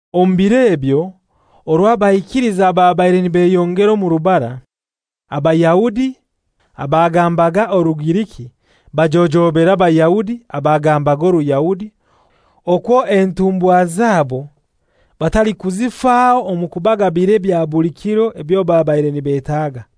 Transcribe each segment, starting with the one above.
Omu biro ebyo orwo abaikiliza babaire nibeyongera omu rubara, Abayahudi abagambaga Orugiriki bajojobera Abayahudi abagambaga Oruyahudi okwo entumbwakazi zabo batalikuzifaho omu kubagabira ebya buli kiro ebyo babaire nibetaga.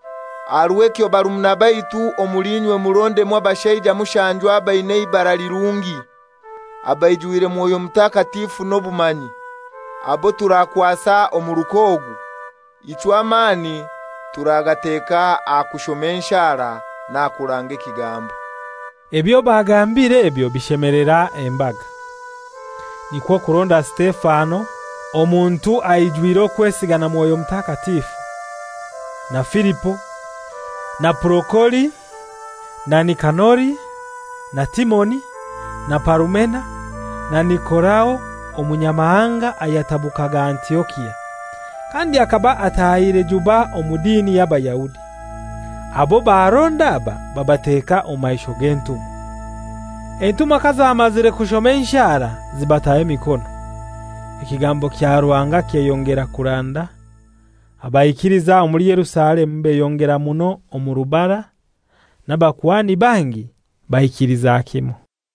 Aha rw'ekyo barumuna baitu, omuli inywe murondemu abashaija mushanju abaina eibara lirungi, abaijwire Mwoyo Mutakatifu n'obumanyi, abo turakwasa omuruka ogu. Ichwe amani turagateka aha kushoma enshara n'aha kuranga ekigambo.» Ebyo bagambire ebyo bishemelera embaga. Nikwo kuronda Sitefano, omuntu aijwire okwesiga na Mwoyo Mutakatifu, na Filipo, na Purokori, na Nikanori, na Timoni, na Parumena, na Nikolao Omunyamahanga ayatabukaga Antiokia, kandi akaba atahire juba omu dini y'Abayahudi. Abo baronda aba babateka omu maisho g'entumwa. Entumwa kazamazire kushoma enshara zibataho emikono. Ekigambo kya Ruhanga kyeyongera kuranda. Abaikiliza omuli Yerusalemu beyongera muno omu rubara, n'abakuhani bangi baikiliza kimoi.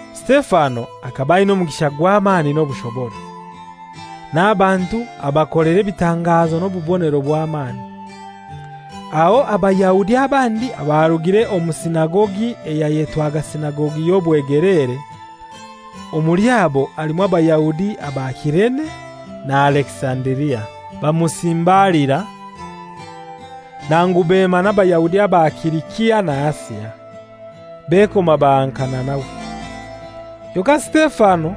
Sitefano akaba aina omugisha gw'amani n'obushobora. N'abantu abakolera ebitangazo n'obubonero obw'amani. Aho Abayahudi abandi abarugire omu sinagogi eyayetwaga sinagogi y'obwegeleere, omuli abo halimu Abayahudi aba Kirene na Alekisandiria, bamusimbalira. Nangu bema n'Abayahudi aba Silisia na Asia, bekoma bahankana nawe. Kyonkai Sitefano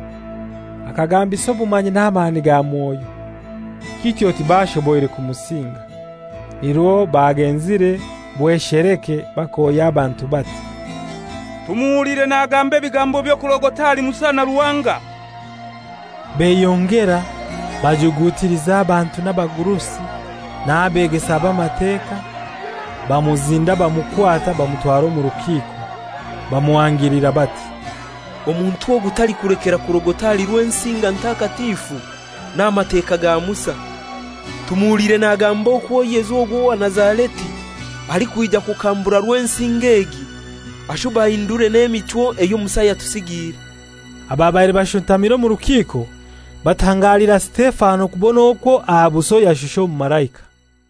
akagambisa obumanyi n'amani ga Mwoyo, kityo tibashoboire kumusinga. Nirwo bagenzire bwesheleke bakohya abantu bati, «Tumuhuliire nagamba ebigambo by'okurogota ahali Musa na Ruhanga.» Beyongera bajugutiliza abantu n'abagurusi n'Abeegesa b'Amateka, bamuzinda bamukwata, bamutwara omu rukiiko. Bamuhangilira bati, «Omuntu ogu talikulekera kurogota ahali Rwensinga ntakatifu n'aha Mateka ga Musa. Tumuhuliire nagamba okwo Yesu ogu owa Nazareti alikwija kukambura Rwensinga egi, ashube ahindure n'emichwo eyo Musa yatusigiire.» Ababaire bashuntamire omu rukiiko batangalira Sitefano kubona okwo aha buso yashusha omumalaika.